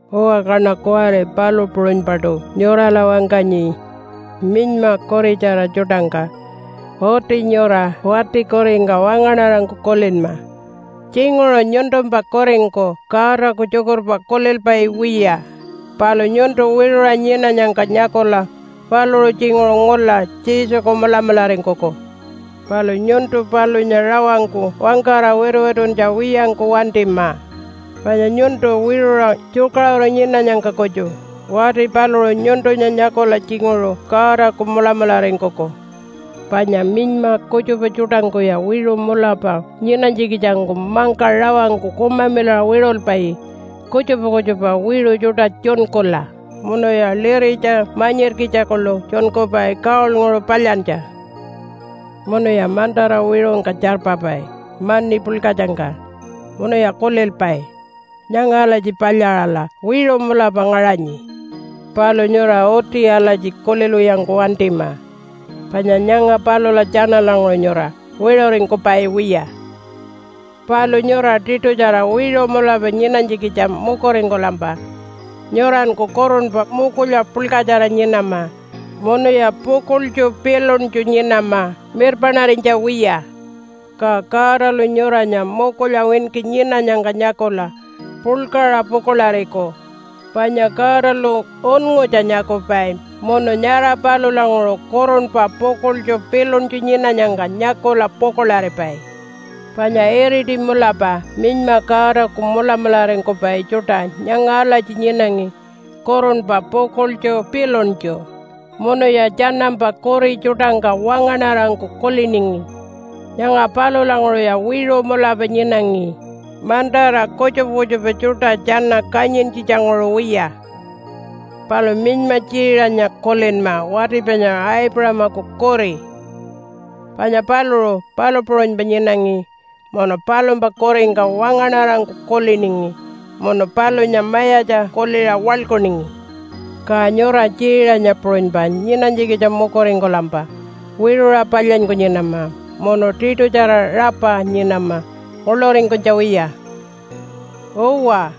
Uwa, kaṉa kuwari palu puṟunypaṯu nyurala wangkanyi minyma kuritjara tjuṯangka. Uti nyura wati kuringka wangaṉarangku kulinma. Tjinguṟu nyuntumpa kuringku Godaku tjukurpa kulilpai wiya, palu nyuntu wiṟuṟa nyinanyangka nyakula paluṟu tjinguṟu ngula Jesuku mulamularingkuku. Palu nyuntu palunya rawangku wangkara wituwituntja wiyangku wantima, panya nyuntu wiṟuṟa tjukaṟuru nyinanyangka kutju wati paluṟu nyuntunya nyakula tjinguṟu Godaku mulamularingkuku. Panya minyma kutjupa tjuṯangkuya wiṟu mulapa nyinanytjikitjangku mangka rawangku kumamilaṟa wiṟulpai kutjupa kutjupa wiṟu tjuṯa tjunkula, munuya liritja manyirkitja kuḻu tjunkupai gold-nguṟu palyantja. Munuya mantara wiṟungka tjarpapai mani puḻkatjangka, munuya kulilpai, “Nyanga alatji palyaṟala wiṟu mulapa ngaṟanyi.” Palu nyura uti alatji kulilwiyangku wantima, panya nyanga palula tjanalanguṟu nyura wiṟuringkupai wiya. Palu nyura tiṯutjara wiṟu mulapa nyinanytjikitja mukuringkulampa nyuranku kurunpa mukulya puḻkatjara nyinama munuya pukuḻtju piluntju nyinama mirpaṉarinytja wiya. Ka Godalu nyuranya mukulya winki nyinanyangka nyakula puḻkaṟa pukuḻariku, panya Godalu unngutja nyakupai munu nyara palulanguṟu kurunpa pukuḻtju piluntju nyinanyangka nyakula pukuḻaripai. Panya iriti mulapa minyma Godaku mulamularingkupai tjuṯa nyanga alatji nyinangi kurunpa pukuḻtju piluntju, munuya tjanampa kuri tjuṯangka wangaṉarangku kuliningi. Nyanga palulanguṟuya wiṟu mulapa nyinangi, mantara kutjupa kutjupa tjuṯa tjana kanyintjitjanguṟu wiya. Palu minyma Tjiiṟanya kulinma wati panya Aipuṟamaku kuri, panya paluṟu palu puṟunypa nyinangi munu palumpa kuringka wangaṉarangku kuliningi munu palunya mayatja kuliṟa waḻkuningi. Ka nyura Tjiiṟanya puṟunypa nyinanytjikitja mukuringkulampa wiṟuṟa palyanyku nyinama munu tiṯutjara rapa nyinama nguḻuringkunytja wiya. Uwa,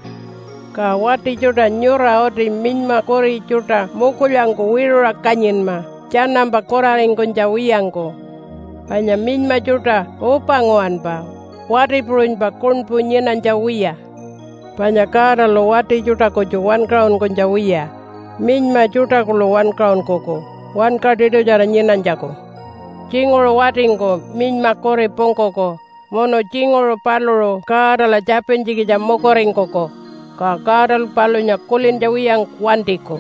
ka wati tjuṯa nyura uti minyma kuri tjuṯa mukulyangku wiṟuṟa kanyinma tjanampa kuraringkunytja wiyangku, panya minyma tjuṯa upa nguwanpa wati puṟunypa kuṉpu nyinanytja wiya. Panya Godalu wati tjuṯa kutju wankaṟunkunytja wiya minyma tjuṯa kuḻu wankaṟunkuku wanka tiṯutjara nyinanytjaku. Tjinguṟu watingku minyma kuri pungkuku munu tjinguṟu paluṟu Godala tjapintjikitja mukuringkuku, ka Godalu palunya kulintja wiyangku wantiku.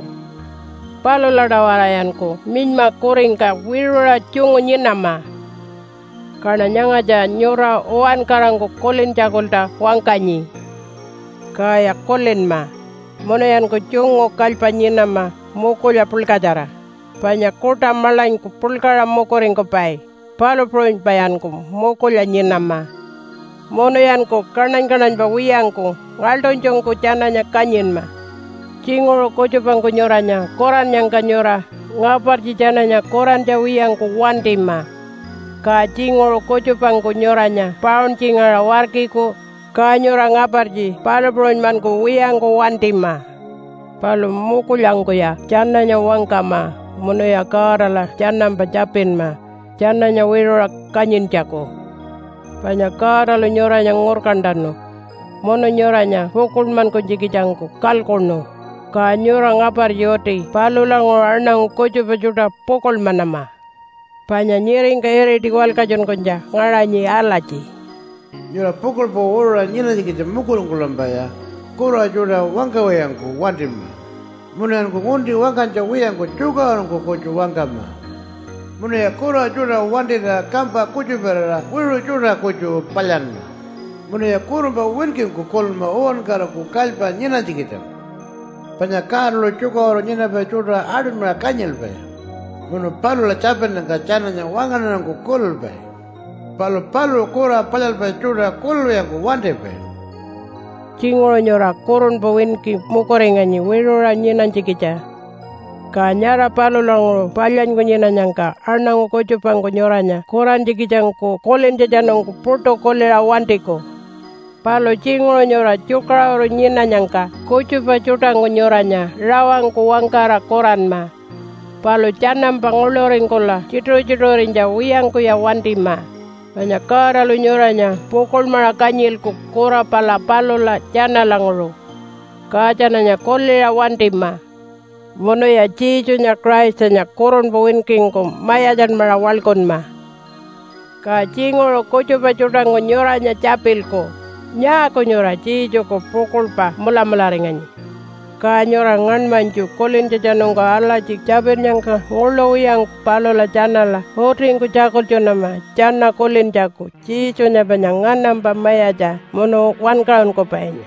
Palula-tawarayanku minyma kuringka wiṟuṟa tjungu nyinama. Kaṉa nyangatja nyura uwankarangku kulintjakulta wangkanyi. Kaya kulinma, munuyanku tjungu kalypa nyinama mukulya puḻkatjara, panya kuṯa maḻanyku puḻkaṟa mukuringkupai, palu puṟunypayanku mukulya nyinama. Munuyanku kaṉany-kaṉanypa wiyangku ngaḻṯunytjungku tjananya kanyinma. Tjinguṟu kutjupangku nyuranya kurannyangka nyura ngapartji tjananya kurantja wiyangku wantima. Ka tjinguṟu kutjupangku nyuranya pauntjingaṟa warkiku, ka nyura ngapartji palu puṟunymankuwiyangku wantima. Palu mukulyangkuya tjananya wangkama munuya Godala tjanampa tjapinma tjananya wiṟuṟa kanyintjaku. Panya Godalu nyuranya ngurkantanu munu nyuranya pukuḻmankunytjikitjangku kalkuṉu, ka nyura ngapartji uti palulanguṟu aṉangu kutjupa tjuṯa pukuḻmanama. Panya nyiringka iriti walkatjunkunytja ngaṟanyi alatji, “Nyura pukuḻpa wiṟuṟa nyinanytjikitja mukuringkulampaya kura tjuṯa wangkawiyangku wantima, munuyanku ngunti wangkanytja wiyangku tjukaṟurungku kutju wangkama. Munuya kura tjuṯa wantira kampa kutjuparira wiṟu tjuṯa kutju palyanma, munuya kurunpa winkingku kulinma uwankaraku kalypa nyinanytjikitjangku. Panya Godalu tjukaṟuru nyinapai tjuṯa aṯunymaṟa kanyilpai, munu palula tjapinnyangka tjananya wangaṉarangku kulilpai. Palu paluṟu kura palyalpai tjuṯa kulilwiyangku wantipai.” Tjinguṟu nyura kurunpa winki mukuringanyi wiṟuṟa nyinanytjikitja, ka nyara palulanguṟu palyanyku nyinanyangka aṉangu kutjupangku nyuranya kurantjikitjangku kulintjatjanungku puṯu kuliṟa wantiku. Palu tjinguṟu nyura tjukaṟuru nyinanyangka kutjupa tjuṯangku nyuranya rawangku wangkara kuranma. Palu tjanampa nguḻuringkula tjituṟu-tjituṟurinytja wiyangkuya wantima, panya Godalu nyuranya pukuḻmaṟa kanyilku kura pala palula tjanalanguṟu. Ka tjananya kuliṟa wantima. Munuya Jesunya Christanya kurunpa winkingku mayatjanmaṟa waḻkunma. Ka tjinguṟu kutjupa tjuṯangku nyuranya tjapilku, “Nyaaku nyura Jesuku pukuḻpa mulamularinganyi?” Ka nyura ngaṉmanytju kulintjatjanungku alatji tjapinnyangka nguḻu wiyangku palula tjanala utingku tjakultjunama tjana kulintjaku Jesunya panya nganampa mayatja munu wankaṟunkupainya.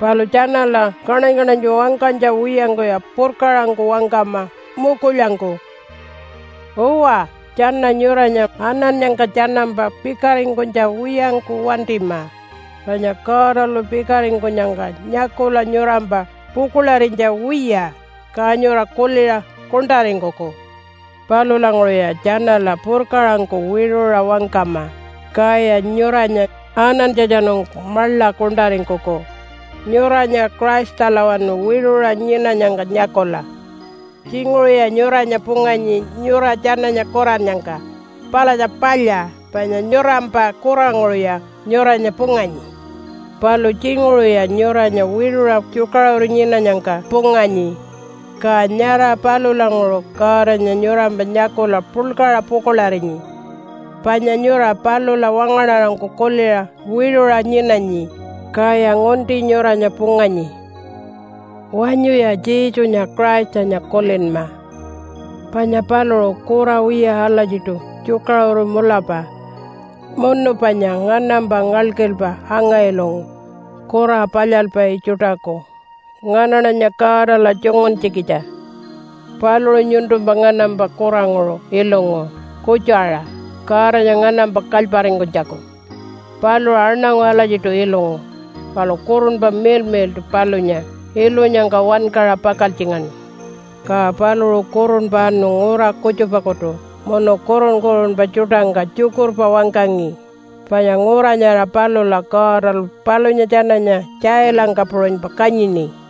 Palu tjanala kaṉany-kaṉanytju wangkanytja wiyangkuya purkaṟangku wangkama mukulyangku. Uwa, tjana nyuranya anannyangka tjanampa pikaringkunytja wiyangku wantima, panya Godalu pikaringkunyangka nyakula nyurampa pukuḻarinytja wiya, ka nyura kuliṟa kuṉṯaringkuku. Palulanguṟuya tjanala purkaṟangku wiṟuṟa wangkama, kaya nyuranya anantjatjanungku maḻa kuṉṯaringkuku nyuranya Christalawanu wiṟuṟa nyinanyangka nyakula. Tjinguṟuya nyuranya punganyi nyura tjananya kurannyangka palatja palya panya nyurampa kuranguṟuya nyuranya punganyi. Palu tjinguṟuya nyuranya wiṟuṟa tjukaṟuru nyinanyangka punganyi, ka nyara palulanguṟu Godanya nyurampa nyakula puḻkaṟa pukuḻarinyi, panya nyura palula wangaṉarangku kuliṟa wiṟuṟa nyinanyi, kaya ngunti nyuranya punganyi. Wanyuya Jesunya Christanya kulinma, panya paluṟu kura wiya alatjiṯu tjukaṟuru mulapa munu panya nganampa ngalkilpa anga-ilungu kura palyalpai tjuṯaku nganaṉanya Godala tjunguntjikitja. Paluṟu nyuntumpa nganampa kuranguṟu ilungu kutju-aṟa Godanya nganampa kalyparingkunytjaku. Paluṟu aṉangu alatjiṯu ilungu, palu Kurunpa Miḻmiḻṯu palunya ilunyangka wankaṟa pakaltjingaṉu. Ka paluṟu kurunpa anu ngura kutjupakutu munu kurun-kurunpa tjuṯangka tjukurpa wangkangi, panya ngura nyara palula Godalu palunya tjananya tjailangka puṟunypa kanyini.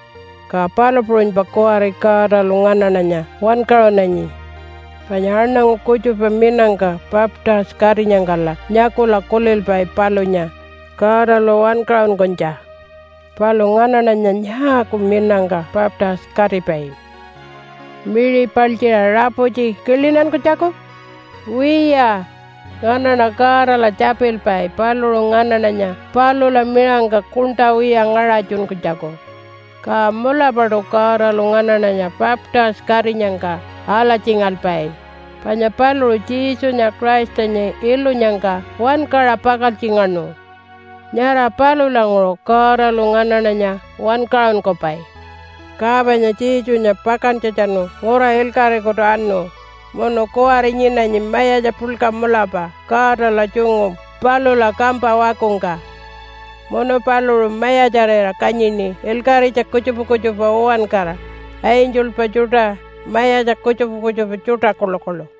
Ka palu puṟunypa kuwari Godalu nganaṉanya wankaṟunanyi. Panya aṉangu kutjupa minangka baptise-katinyangkala nyakula kulilpai palunya Godalu wankaṟunkunytja. Palu nganaṉanya nyaaku minangka baptise-katipai? Miṟi paltjiṟa raputji kilinankunytjaku? Wiya, nganaṉa Godala tjapilpai paluṟu nganaṉanya palula miṟangka kuṉṯa wiya ngaṟatjunkunytjaku. Ka mulapaṯu Godalu nganaṉanya baptise-katinyangka alatjingalpai, panya paluṟu Jesunya Christanya ilunyangka wankaṟa pakaltjingaṉu, nyara palulanguṟu Godalu nganaṉanya wankaṟunkupai. Ka panya Jesunya pakantjatjanu ngura ilkaṟikutu anu munu kuwari nyinanyi mayatja puḻka mulapa Godala tjungu palula kampa wakungka, munu paluṟu mayatjarira kanyini ilkaṟitja kutjupa kutjupa uwankara, angelpa tjuṯa, mayatja kutjupa kutjupa tjuṯa kuḻukuḻu.